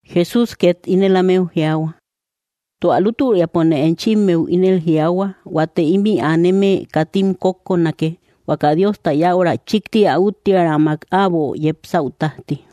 Jesús ket ínel ámeu jiaahua: —Tua lútüriapone enchimmeu ínel jiaahua, huate ímï aneme katim kókkonake, huaka Diosta yäura chíkti ä úttiärammak äbo yepsäu tájti.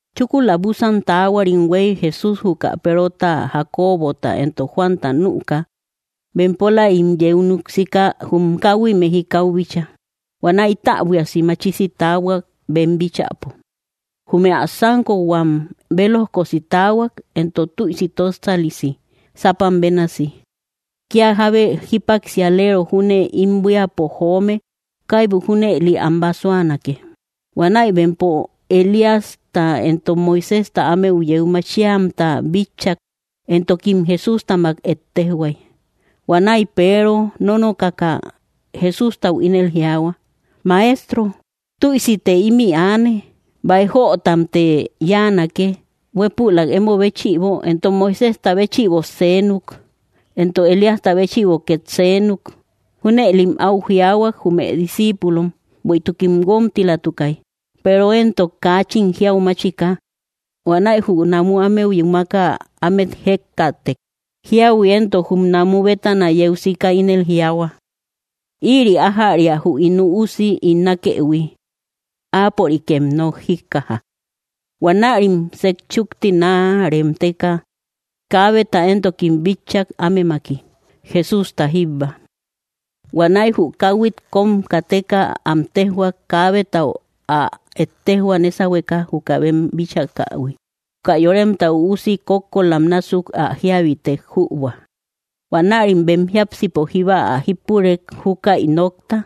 Chúkula búsan taahuarim huéy, Jesús juka Perota, Jacobota, entok Juanta nüka, bempolaim yeu núk siika, jum káhui mejikau bíchaa. Huanäi täbuiasi machisi taahuak bem bíchäpo. Jume ä sánkohuam bélojkosi taahuak, entok tüisi tósalisi, sápam bénasi, kia jábe jípaksialeero júne ím buíapo joome kaibu junëli am basuanake. Huanäi bempo Elíasta éntok Moiséjta ámeu yeu machiamta bitchak, entokim Jesústamak ettejhuay. Huanäi Peero nónokaka, Jesústau ínel jiaahua: —Maestro, ¡tüisite ímï aane! Báij jötamte yáanake: huépülak emo béchïbo, entok Moiséjta béchïbo seenuk, entok Elíasta béchïbo ket seenuk. Junëlim áu jiaahuak jume discípulom bueïtukim guómtilamtukay, Peero éntok kaachin jiau máchika. Huanäi jü namu ámeu yúmaka ámet jëkkaatek. Jíahui éntok jum namu bétana yeu sika ínel jiaahua: —Ïri ájäria jü ín Üusi ín nákëhui; áapörikem nok jíkkaja. Huanärim sejchúkti naa remteka, kaabeta éntokim bitchak ámemaki, Jesústa jíbba. Huanäi jü káuhuit kóm kateka, am téjhuak kaabetau ä ettejhua nésauhueka juka bem bíchakähui, juka Yoremta Üusi kókkolam násuk ä jíabitek jübua. Huanärim bem jiápsipo jíba ä jípurek júkäi nokta,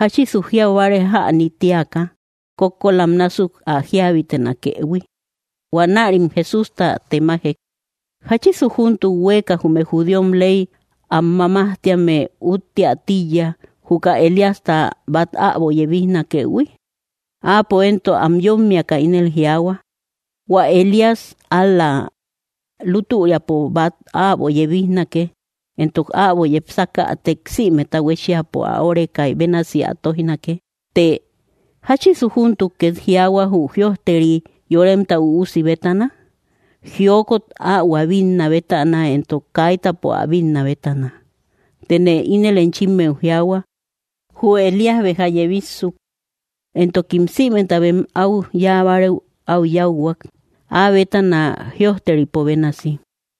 jáchisu jiaubáare jäni tï éaka kókkolam násuk ä jíabitenakëhui. Huanärim Jesústam temajek: —¿Jáchisu júntuk huéeka jume judíom ley am mamájtéame útteä tíiya juka Elíasta bat äbo yebíjnakëhui? Áapo éntok am yommiaka ínel jiaahua: —Huä Elías ál‑la lútüriapo bat äbo yebíjnake, éntok äbo yepsakätek sïmeta huéchiapo ä órekay bénasi ä tóijnake. Të, ¿jáchisu júntuk ket jiaahua jü jïojteri Yoremta Üusi bétana? Jiokot ahuä bitna bétana, éntok kaitäpo ä bítna bétana. Tëne ínel enchimeu jiaahua, jü Elías béja yebíssuk, éntokim sïmeta bem au yáabárëu au yáuhuak, áa bétana jïojteripo bénasi.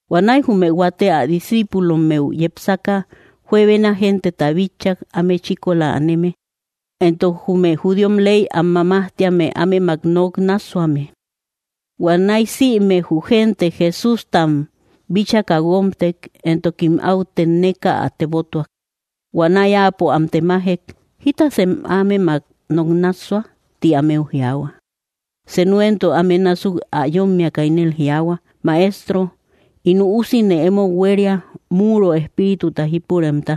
Huanäi jume huate ä discíipulommeu yepsaka, juebena genteta bitchak áme chíkola aneme, éntok jume judíom ley am mamájtíame ámemak noknássuame. Huanäi, sïme jü gente Jesústam, bíchakä guómtek, éntokim au tenneka ä tebótuak. Huanäi Áapo am temájek: —¿Jítasem ámemak noknássua? —ti ámeu jiaahua. Senu éntok áme násuk ä yómmiakä ínel jiaahua: —Maestro, ín üúsine emou huéria, múuro espírituta jípuremta.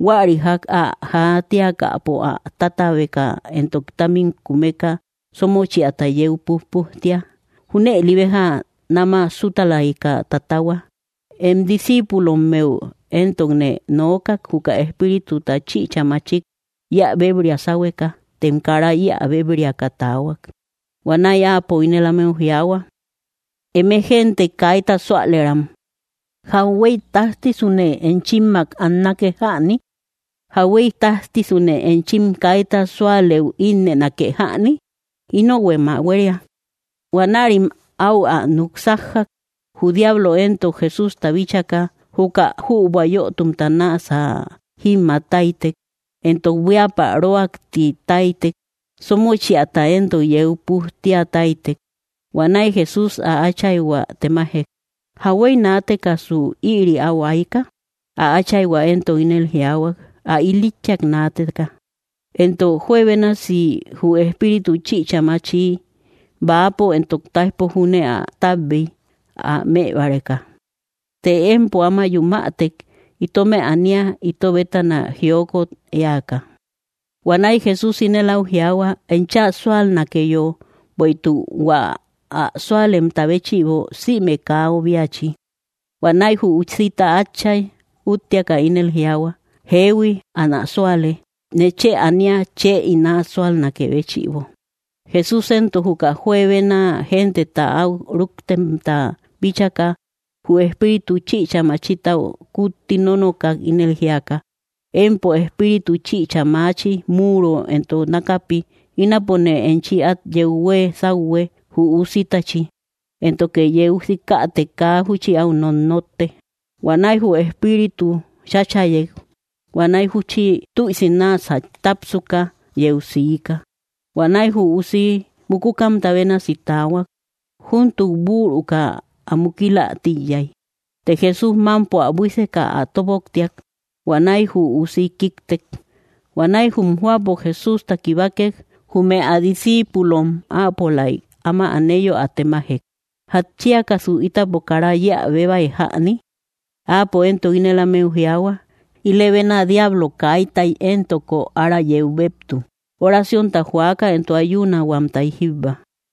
Huäri jak ä jaatíakäpo, ä tatabeka éntok támmim kumeka sómöchiata yeu pujpujtía. Júnëli béja nama sutalayka tatahua. Em discíipulommeu éntokne nookak juka espírituta chichä machik yeä béebria sáhueka, tem kára yeä béebriakä taahuak. Huanäi Áapo ínel ámeu jiaahua: —¡Eme gente kaíta súalëram! ¿Jahuéi tájtisune enchimmak annake jäni? ¿Jahuéi tájtisune enchim kaíta súalëu ínnënake jäni? Ínohuem ä huéria. Huanärim au ä núk sájjak. Jü diablo éntok Jesústa bíchaka, juka jübua yotumta náasä jímmaataitek, éntok buíapä röaktitaitek, sómöchiata éntok yeu pujtíataitek. Huanäi Jesús ä atchaihua temájek: —¿Jahuéi naatekasu ïri au aika? Ä áchaihua entok ínel jiaahuak: —Ä ilítchiak naateka; éntok juebénasi jü espíritu chichä machi bäapo éntok taijpo júne ä tabbei ä mëbáreka. Të empo áma yumätek, itómë anía ito bétana jiokot éaka. Huanäi Jesús ínel au jiaahua: —Enchä súalnakeyo, bueïtuk hua ä súalemta béchïbo sïme kaa obíachi. Huanäi jü usita atchai úttiaka ínel jiaahua: —Jeehui, anä súale; nechë anía chë ín ä súalnakë béchïbo. Jesús éntok juka juebena genteta au rúktemta bíchaka, jü espíritu chichä machitau kutti nonokak, ínel jíaka: —Empo espíritu chichä machi múuro éntok nákapi, ínapone enchi at yeu huee sáuhue jü usítachi, éntoke yeu sikätek kaa júchi au nonnotte. Huanäi jü espíritu cháchayek, huanäi júchi tüisi náasä tápsuka, yeu siika. Huanäi jü usi mukúkamta bénasi taahuak, júntuk bürukä ä mukila tíiyai. Të Jesús mámpo ä buíseka, ä tóboktiak; huanäi jü usi kíktek. Huanäi jum jóapo Jesústa kibákek, jume ä discíipulom áapolaik áma aneyo ä temajek: —¿Jatchíakasu ítapo kara yeä béebai jäni? Áapo éntok ínel ámeu jiaahua: —Ilëbena diablo kaítai éntoko ára yeu beptu oraciónta juaka entok ayunahuamtay jíbba.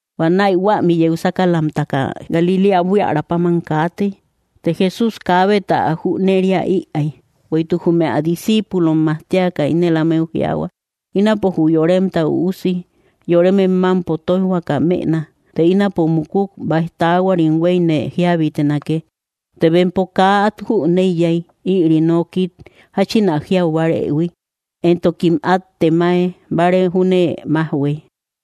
Huanäi huämi yeu sákalamtaka, Galiléa buiära páman kaatei; të Jesús kaabeta ä jüneriä ïai. Bueïtuk jume ä discíipulom majtiaka ínel ámeu jiaahua: —Ínapo jü Yoremta Üusi yoremem mampo tóijhuaka mëna. Të ínapo mukuk, baij taahuarim hueine jíabitenake. Të bempo kaa at jüneiyai ïri nokit jachin ä jiau bárëhui, éntokim at temae báare júne majhuëi.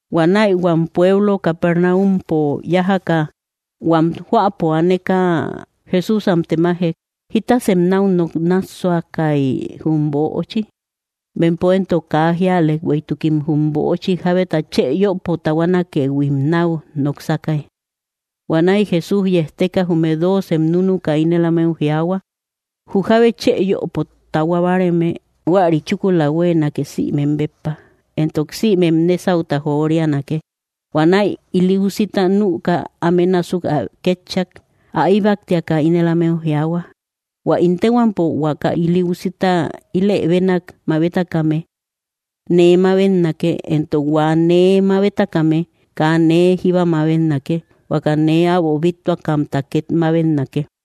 Huanäi huam pueblo Capernáumpo yájaka, huam jóapo aneka, Jesús am temajek: —¿Jítasem nau nok nássuasakai jum böochi? Bempo éntok kaa jíalek, bueïtukim jum böochi jábeta chë yöpo tahuánakëhuim nau noksakai. Huanäi Jesús yejteka, jume dóocem núnuka, ínel ámeu jiaahua: —Jü jábe chë yöpo tahua báareme, huäri chúkula huéenake sïmem béppa, éntok sïmem nésauta joríanake. Huanäi ili úsita nüka, áme násuk ä kétchak. Ä íbaktiaka ínel ámeu jiaahua: —Huä ín téhuampo huaka ili úsita ílëbenak mabetakame, nee mabetnake; éntok hua nee mabetakame, kaa nee jíba mabetnake, huaka nee äbo bíttuakamta ket mabetnake.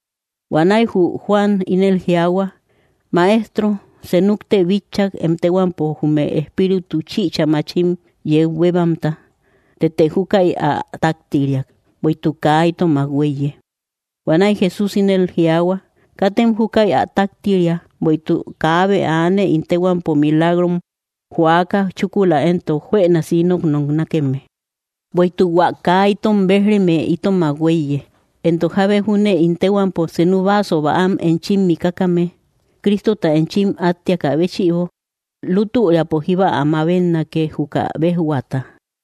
Huanäi jü Juan ínel jiaahua: —Maestro, senukte bitchak em téhuampo jume espíritu chichä machim yeu bébamta, tëte júkäi ä táktiriak, bueïtuk kaa itomak huéiye. Huanäi Jesús ínel jiaahua: —Katem júkäi ä taktiria, bueïtuk kaabe aane ín téhuampo milagrom joákä chúkula éntok juënasi ínot noknákeme. Bueïtuk hua kaa itom béj‑reme itomak huéiye. Éntok jábe júne ín téhuampo senu vaso bäam enchim mikakame, Crístota enchim átteakä béchïbo, lútüriapo jíba ä mabetnake juka béjhuata.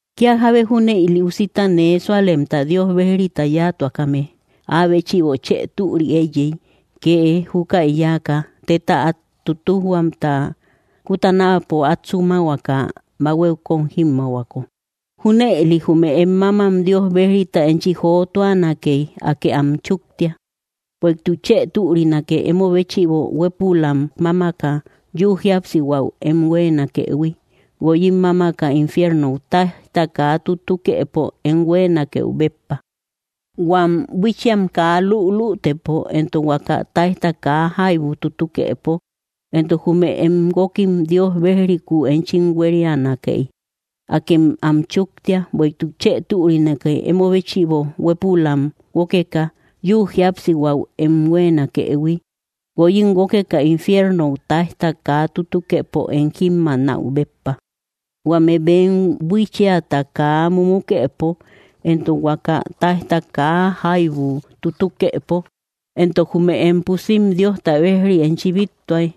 ’Kia jábe júne ili usi nee súalemta Dios bejrita yatuakame, áa béchïbo chë türi éiyey kee júkäi yáaka, téta át tútujhuamta kutänaapo át súmahuaka bahuéu kóm jímmaahuako. Júnëli jume em mámmam Dios bejrita enchi jóotuanakey, Akë am chúktia. Bueïtuk chë türinake emo béchïbo huépülam mámaka yúu jíapsihuäu em huéenakëhui, guoyim mámaka infiernou táijta kaa tutukëpo em huéenakeu béppa, huam buíchiam kaa lülütëpo, éntok huaka táijta kaa jaibu tutukëpo. Éntok jume em guókkim Dios bejrikuu enchi huérianakey, Akë am chúktia. Bueïtuk chë türinake emo béchïbo huépülam guókeka yü jíapsihuäu em huéenakëhui, guoyim guókeka infiernou táijta kaa tutukëpo em jímmaanäu béppa, huame bem buíchiata kaa mumukëpo, entok huaka táijta kaa jaibu tutukëpo. Éntok jume em pusim Dios bejrita enchi bíttuay,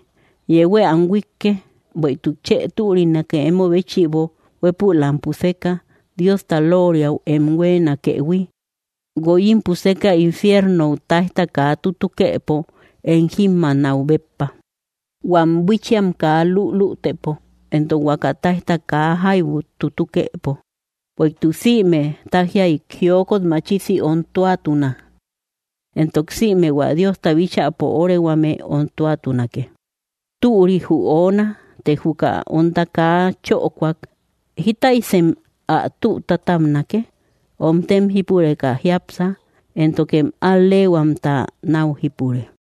yehuë am huíkke. Bueïtuk chë türinake emo béchïbo huépülam puseka Diosta lóoriau em huéenakëhui, guoyim puseka infiernou táijta kaa tutukëpo em jímmaanäu béppa, huam buíchiam kaa lülütëpo, entok huaka táijta kaa jaibu tutukëpo. ’Bueïtuk sïme tájiay jiokot machisi ontuatuna, entok sïme hua Diosta bíchäpo órehuame ontuatunake. Türi jü oona, të juka onta kaa chökoak, ¿jítasuysem ä tü tátabnake? Omtem jípureka jiápsa, éntokem al‑leehuamta nau jípure.